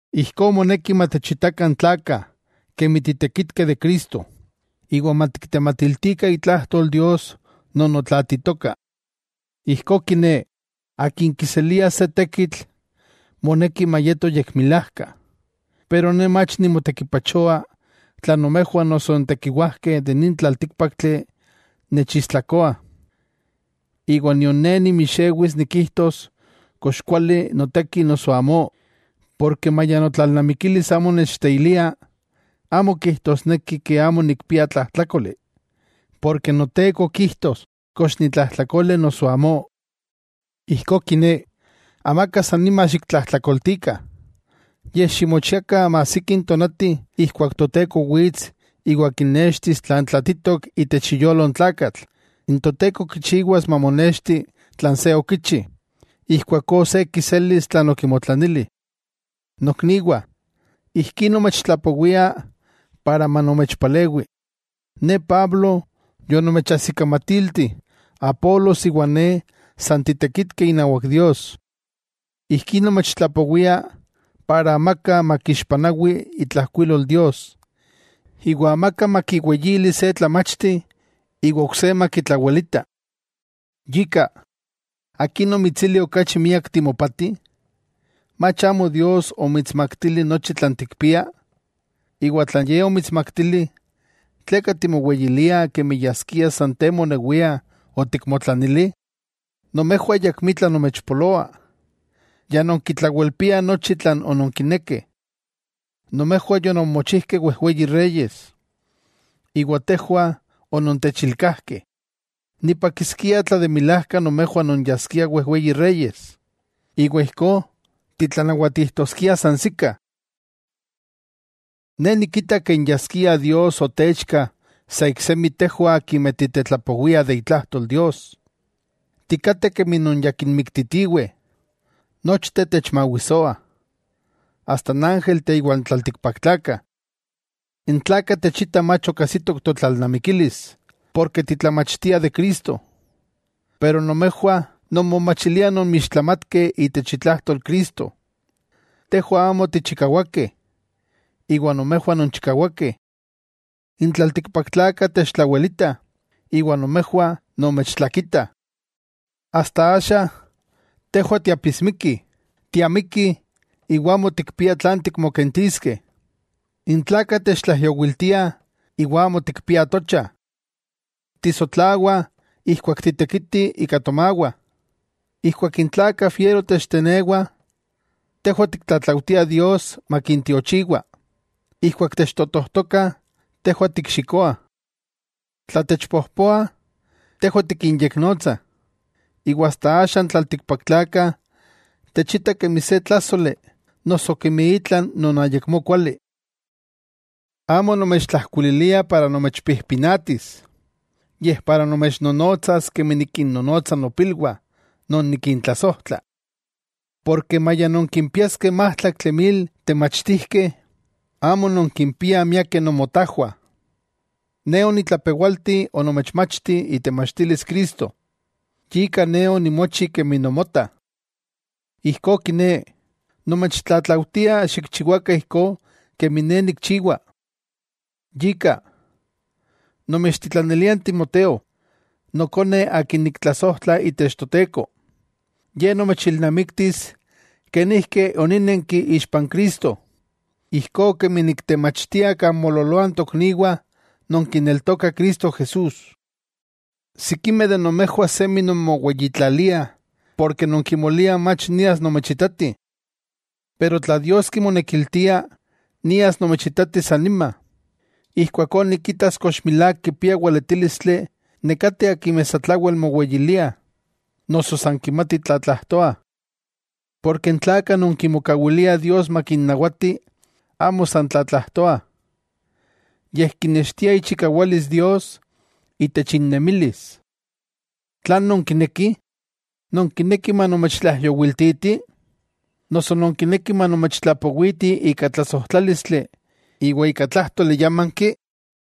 Ijkó moneki matechitakah n tlakah kemi titekitkeh de Cristo, iwa matiktematiltikah itlajtol Dios non otlaatitoka. Ijkó kiné, akin kiselia se tekitl, moneki mayeto yekmilajka. Pero ne mach nimotekipachoa tla nomejwah noso n tekiwajkeh de nin tlaltíkpaktli nechistlakoa. Iwa nion ne nimixewis nikijtos kox kuali noteki noso amó. Porke maya notlalnamikilis amo nechteilia, amo kijtosneki amo nikpia tlajtlákoli. Porke Noteko kijtos kox nitlajtlakole noso amó. Ijkó kiné, amaka san nima xiktlajtlakoltikah, yej ximochiakah maajsiki n tonati ijkuak Toteko wits iwa kinextis tlan tlaatitok itech iyolo n tlakatl, n Toteko kichiwas mamonexti tlan se okichi, ijkuakó se kiselis tlan okimotlanili. Nokniwah, ijkí nomechtlapowia para manomechpalewi. Ne Pablo yonomechajsikamatilti Apolos iwa ne san titekitkeh inawak Dios. Ijkí nomechtlapowia para amaka makixpanawi itlajkuilol Dios, iwa amaka makiweyili se tlamachti iwa ok se makitlawelita. Yika, ¿akin omitsili okachi miak timopati? ¿Mach amo Dios omitsmaktili nochi tlan tikpia? Iwa tla Ye omitsmaktili, ¿tleka timoweyilia kemi yaskia san te monewia otikmotlanili? Nomejwah ayakmitla nomechpoloa, ya nonkitlawelpiah nochi tlan ononkinekeh. Nomejwah yononmochijkeh wejweyi reyes, iwa tejwah onontechilkajkeh. ¡Nipakiskia tla de milajka nomejwah nonyaskiah wejweyi reyes, iwa ijkó titlanawatijtoskiah sansikah! Ne nikita ken yaskia Dios otechka sa iksemi tejwah akimeh titetlapowiah de itlajtol Dios. Tikateh kemi non ya kinmiktitiweh. Nochteh techmawisoah, asta n ángelteh iwa n tlaltikpaktlakah. N tlakah techitah mach ok ajsitok totlalnamikilis porke titlamachtiah de Cristo, pero nomejwah nonmomachiliah nonmixtlamatkeh itech itlajtol Cristo. Tejwah amo tichikawakeh, iwa nomejwah nonchikawakeh. N tlaltikpaktlakah techtlawelitah iwa nomejwah nomechtlakitah. Asta axa, tejwah tiapismikih, tiamikih iwa amo tikpiah tlan tikmokentiskeh, n tlakah techtlaijyowiltiah iwa amo tikpiah tocha, tisotlawah ijkuak titekitih ika tomawah. Ijkuak n tlakah fiero techtenewah, tejwah tiktlatlaujtiah Dios makintiochiwa, ijkuak techtotojtokah tejwah tikxikoah. Tla techpojpoah, tejwah tikinyeknotsah. Iwa asta axa n tlaltikpaktlakah techitah kemi se tlájsoli noso kemi itla non ayakmó kuali. Amo nomechtlajkuililia para nomechpijpinatis, yej para nomechnonotsas kemi nikinnonotsa nopilwah non nikintlasojtla. Porke maya nonkimpiaskeh májtlaktli mil temachtijkeh, amo nonkimpiah miakeh nomotajwah, ne onitlapewalti onomechmachti itemachtilis Cristo, yika ne onimochi kemi nomota. Ijkó kiné, nomechtlatlaujtia xikchiwakah ijkó kemi ne nikchiwa. Yika, nomechtitlanilia n Timoteo, nokone akin niktlasojtla itech Toteko. Ye nomechilnamiktis kenijki onínenki ixpa n Cristo, ijkó kemi niktemachtia kan moololoah n tokniwah non kineltokah Cristo Jesús. Sikimeh de nomejwah semi nonmoweyitlaliah, porke non kimoliah mach nias nomechitati. Pero, tla Dios kimonekiltia, nias nomechitati san nima. Ijkuakó nikitas kox milák kipiah weletílistli nekateh akimeh satlawel moweyiliah, noso san kimatih tlatlajtoah. Porke n tlakah non kimokawiliah Dios makinnawati amo san tlatlajtoah, yej kinextia ichikawalis Dios itech innemilis. ¿Tlan nonkinekih? ¿Nonkinekih manomechtlaijyowiltiti?, noso ¿nonkinekih manomechtlapowiti ika tlasojtlálistli iwa ika tlájtoli yámanki?